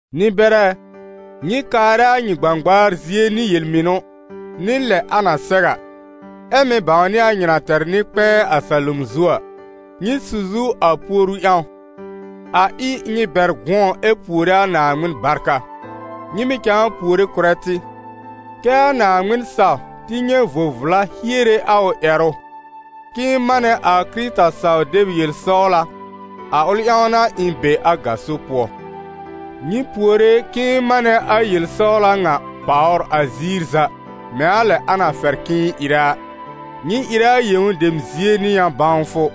Nɩ-bɛrɛ ɛ, nyɩ kaarɛ a nyɩ gbãgbaar zie nɩ yel-mɩnʋ nɩ lɛ a na sɛw a, ɛ mɩ̀ bãwnɩ a nyɩ na tɛr Nɩ-kpɛ̃ɛ a salom zu a. Nyɩ su zu a puoru ƴãw, a ɩ nyɩ bɛr gʋ̃ɔ ɛ puore a Naaŋmɩn barka. Nyɩ mɩ̀ cãa puore kʋrɛ tɩ: kɛ́ a Naaŋmɩn saw tɩ nyɛ̃ vo-vla hiere a ʋ ƴɛrʋ, k'ɩ̃ɩ manɛ a Kɩrɩta saw-deb yel-sɔwla, a ʋl ƴãw n'a ɩ̃ be a gaso pʋɔ. Nyɩ puore k'ɩ̃ɩ manɛ a yel-sɔwla ŋa pàwr a ziir za mɛ̃ a lɛ a na fɛr k'ɩ̃ɩ ɩrɛ a. Nyɩ ɩrɛ a yẽw dem zie nɩ yã-bãwfʋ,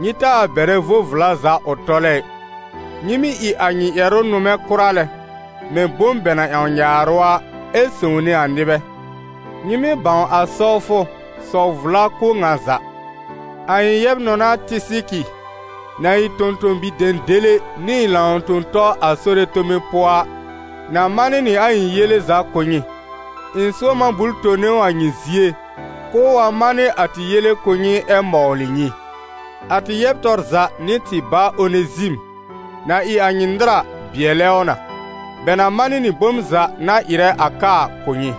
nyɩ taa bɛrɛ vo-vla za ʋ tɔlɛ ɩ. Nyɩ mɩ́ ɩ a nyɩ ƴɛrʋ nʋmɛ kʋra lɛ, mɛ̃ bom bɛ na ƴãw nyaarʋ a, ɛ sõwne a nɩbɛ. Nyɩ mɩ́ bãw a sɔwfʋ, sɔw vla kʋ̀ ŋa za. A ɩ̃ yɛb-nɔna Tɩsɩkɩ, na ɩ tõ-tõ-bi-dẽdẽle nɩ ɩ̃ lãw-tõ-tɔ a Sore tome pʋɔ a, na manɩ nɩ a ɩ̃ yele za kʋ̀ nyɩ. Ɩ̃ sʋ̃ɔm a bul tone ʋ a nyɩ zie, k'ʋʋ wa manɩ a tɩ yele kʋ̀ nyɩ ɛ mɔwlɩ nyɩ. A tɩ yɛb tɔr za nɩ tɩ bá Onezim, na ɩ a nyɩ nɩr a, bɩɛlɛ ʋ na. Bɛ na manɩ nɩ bom za na ɩrɛ a ka a kʋ̀ nyɩ.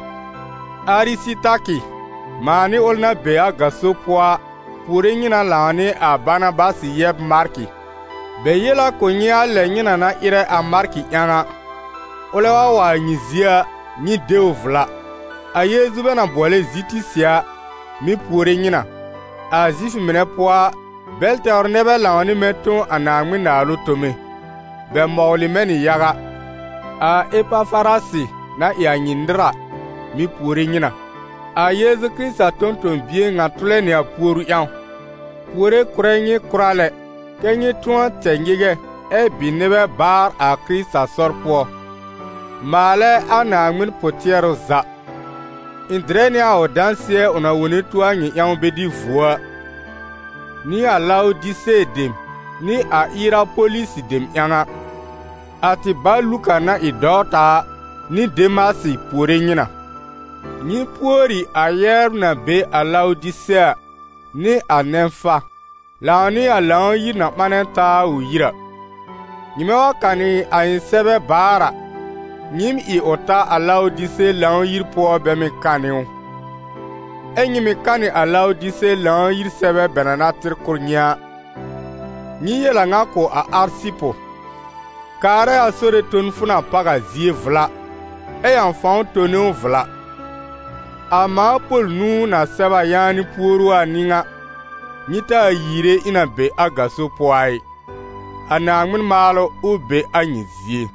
Arɩsɩtakɩ, mãa nɩ ʋl na be a gaso pʋɔ a, puore nyɩ na lãw nɩ a Banabasɩ yɛb Markɩ. Bɛ yel a kʋ̀ nyɩ a lɛ nyɩ na na ɩrɛ a Markɩ ƴãw a: ʋlɛ wa wa a nyɩ zie a, nyɩ de ʋ vla. A Yeezu bɛ na bʋɔlɛ Zitisɩ a, mɩ̀ puore nyɩ na. A Zifʋ mɩnɛ pʋɔ a, bɛl tɛwr nɛ bɛ lãw nɩ mɛ̃ tõ a Naaŋmɩn Naalʋ tome. Bɛ mɔwlɩ mɛ̃ nɩ yaga. A Epafarasɩ na ɩ a nyɩ nɩr a, mɩ̀ puore nyɩ na. A Yeezu Kɩrɩta tõ-tõ-bie ŋa tʋlɛ nɩ a puoru ƴãw, puore kʋrɛ nyɩ kʋra lɛ, kɛ́ nyɩ tʋ̃ɔ tɛ nyɩgɛ ɛ bɩ nɩbɛ baar a Kɩrɩta sɔr pʋɔ, maalɛ a Naaŋmɩn pʋ-tɩɛrʋ za. Ɩ̃ dɩrɛ nɩ a ʋ dãsɩɛ ʋ na wone tuo a nyɩ ƴãw bɛ dɩ vuo a, nɩ a Lawdise dem nɩ a Ierapolisi dem ƴãw a. A tɩ ba Luka na ɩ a dɔwta a, nɩ Demasɩ puore nyɩ na. Nyɩ pùori a yɛbr na be a Lawdise a, nɩ a Nɛ̃fa, lãw nɩ a Lãw-yir na ɓanɛ taa a ʋ yir a. Nyɩmɛ wa kanɩ a ɩ̃ sɛbɛ baar a, nyɩɩm ɩ ʋ ta a Lawdise Lãw-yir pʋɔ bɛ mɩ̀ kanɩ ʋ. Ɛ nyɩ mɩ̀ kanɩ a Lawdise Lãw-yir sɛbɛ bɛ na na tɩr kʋ̀ nyɩ a. Nyɩ yel a ŋa kʋ̀ a Arsɩpʋ: «Kaarɛ a Sore ton fʋ na páw a zie vla, ɛ ƴãw fãw tone ʋ vla.» A mãa Pol nũu, na sɛb a yaanɩ puoru a, n'ɩ ŋa: nyɩ taa yiire ɩ̃ na be a gaso pʋɔ a ɩ. A Naaŋmɩn maalʋ, ʋ be a nyɩ zie.